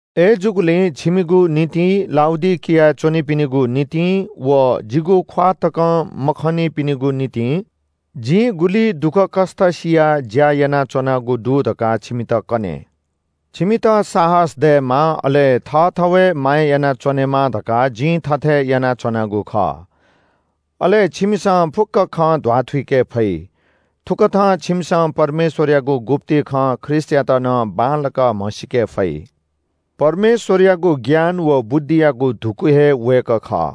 अय्‌जूगुलिं छिमिगु निंतिं, लाउडिकियाय् च्‍वंपिनिगु निंतिं व जिगु ख्‍वाः तकं मखंनिपिनिगु निंतिं जिं गुलि दुःखकष्‍ट सियाः ज्‍या यानाच्‍वनागु दु धकाः छिमित कने। छिमित साहस दयेमा, अले थःथवय् माया यानाच्‍वनेमा धकाः जिं थथे यानाच्‍वनागु खः। अले छिमिसं फुक्‍क खँ ध्‍वाथुइके फइ। थुकथं छिमिसं परमेश्‍वरयागु गुप्‍ति खँ ख्रीष्‍टयात नं बांलाक म्‍हसीके फइ। परमेश्‍वरयागु ज्ञान व बुद्धियागु धुकू हे वय्‌कः खः।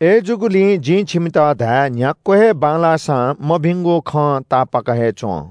अय्‌जूगुलिं जिं छिमित धाये – न्‍ह्याक्‍व हे बांलाःसां मभिंगु खं तापाक हे च्‍वँ।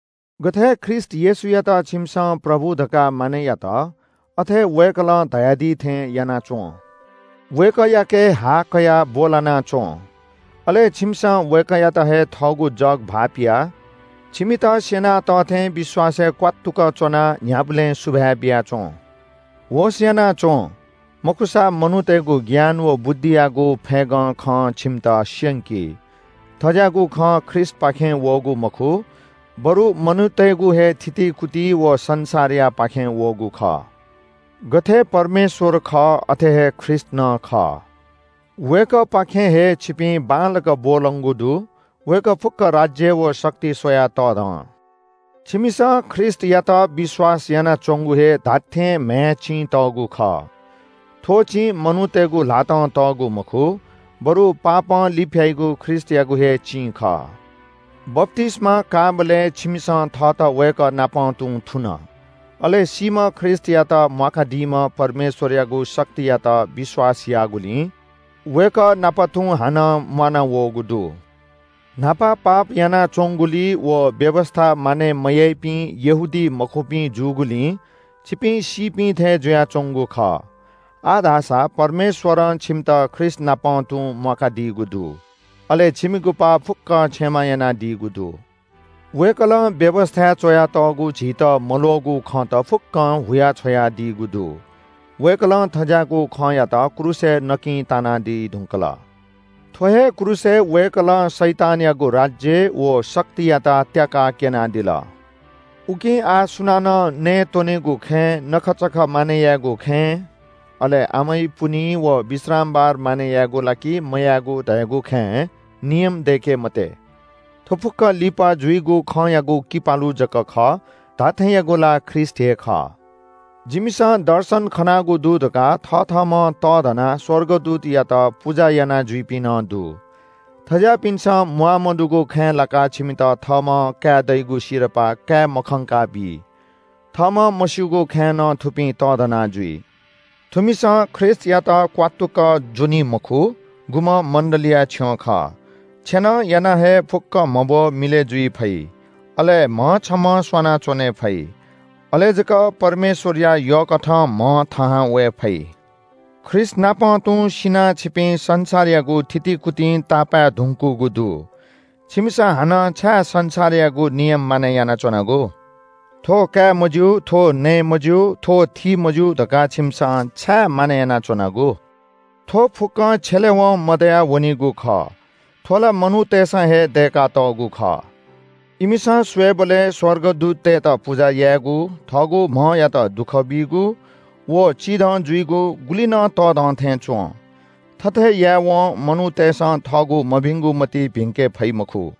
गथे ख्रीष्‍ट येशूयात छिमिसं “प्रभु” धकाः मानय् यात, अथे हे वय्‌कलं धयादी थें याना च्‍वँ। वय्‌कःयाके हा कयाः ब्‍वलना च्‍वँ। अले छिमिसं वय्‌कःयात हे थःगु जग भाःपियाः छिमित स्‍यनातःथें विश्‍वासय् क्‍वात्तुक च्‍वनाः न्‍ह्याबलें सुभाय् बिया च्‍वँ। होश‍ यानाच्‍वँ। मखुसा मनूतय्‌गु ज्ञान व बुद्धियागु फय्‌गं खं छिमित स्‍यंकी। थज्‍याःगु खँ ख्रीष्‍टपाखें वःगु मखु, बरु मनूतय्‌गु हे थितिकुति व संसारयापाखें वःगु खः। गथे परमेश्‍वर खः, अथे हे ख्रीष्‍ट नं खः। वय्‌कःपाखें हे छिपिं बांलाक ब्‍वलंगु दु। वय्‌कः फुक्‍क राज्‍य व शक्ति स्‍वयाः तःधं। छिमिसं ख्रीष्‍टयात विश्‍वास यानाच्‍वंगु हे धात्‍थें म्‍हय् चिं तःगु खः। थ्‍व चिं मनूतय्‌गु ल्‍हातं तःगु मखु, बरु पापं लिफ्‍याइगु ख्रीष्‍टयागु हे चिं खः। बप्‍तिस्‍मा काःबलय् छिमिसं थःत वय्‌कःनापं तुं थुन। अले सीम्‍ह ख्रीष्‍टयात म्‍वाकादीम्‍ह परमेश्‍वरयागु शक्तियात विश्‍वास याःगुलिं वय्‌कः नाप तुं हानं म्‍वानावःगु दु। न्‍हापा पाप यानाच्‍वंगुलिं व व्‍यवस्‍था मानय् मयाइपिं यहूदीमखुपिं जूगुलिं छिपिं सीपिं थें जुयाच्‍वंगु खः। आः धाःसा परमेश्‍वरं छिमित ख्रीष्‍टनापं तुं म्‍वाकादीगु दु। अले छिमिगु पाप फुक्‍कं क्षमा यानादीगु दु। वय्‌कलं व्‍यवस्‍थाय् च्‍वयातःगु झीत मल्‍वःगु खँत फुक्‍कं हुयाछ्‌वयादीगु दु। वय्‌कलं थज्‍याःगु खँयात क्रूसय् नकिं तानादी धुंकल। थ्‍व हे क्रूसय् वय्‌कलं शैतानयागु राज्‍य व शक्तियात त्‍याकाः क्‍यनादिल। उकिं आः सुनानं नयेत्‍वनेगु खँय्, नखःचखः मानय् यायेगु खँय्, अले अमै, पुन्‍हि व विश्रामबार मानय् यायेगु ला कि मयायेगु धयागु खँय् नियम दय्‌के मते। थ्‍व फुक्‍क लिपा जुइगु खँयागु किपालु जक खः। धात्‍थेंयागु ला ख्रीष्‍ट हे खः। “जिमिसं दर्शन खनागु दु” धकाः थथःम्‍हं तःधनाः स्‍वर्गदूतयात पुजा यानाजुइपिं नं दु। थज्‍याःपिन्‍सं म्‍वाःमदुगु खँय् लाकाः छिमित थःम्‍हं काये दइगु सिरपाः काये मखंका बी। थःम्‍हं मस्‍यूगु खँय् नं थुपिं तःधना जुइ। थुमिसं ख्रीष्‍टयात क्‍वात्तुक ज्‍वनी मखु, गुम्‍ह मण्‍डलीया छ्यं खः। छेनं यानाः हे फुक्‍क म्‍हब्‍व मिलय् जुइ फइ, अले म्‍ह छम्‍हं स्‍वाना च्‍वने फइ। अले जक परमेश्‍वरया यःकथं म्‍ह थाहां वये फइ। ख्रीष्‍टनापं तुं सिनाः छिपिं संसारयागु थितिकुतिं तापाय् धुंकूगु दु। छिमिसं हानं छाय् संसारयागु नियम मानय् यानाच्‍वनागु? “थ्‍व काये मज्‍यू, थ्‍व नये मज्‍यू, थ्‍व थीमज्‍यू” धकाः छिमिसं छाय् मानय् यानाच्‍वनागु? थ्‍व फुक्‍कं छ्यलेवं मदयावनीगु खः। थ्‍व ला मनूतय्‌सं हे दय्‌कातःगु खः। इमिसं स्‍वयेबलय् स्‍वर्गदूततय्‌त पुजा यायेगु, थःगु म्‍हयात दुःख बीगु, व चिधं जुइगु गुलि नं तःधं थें च्‍वं। थथे यायेवं मनूतय्‌सं थःगु मभिंगु मतिइ भिंके फइ मखु।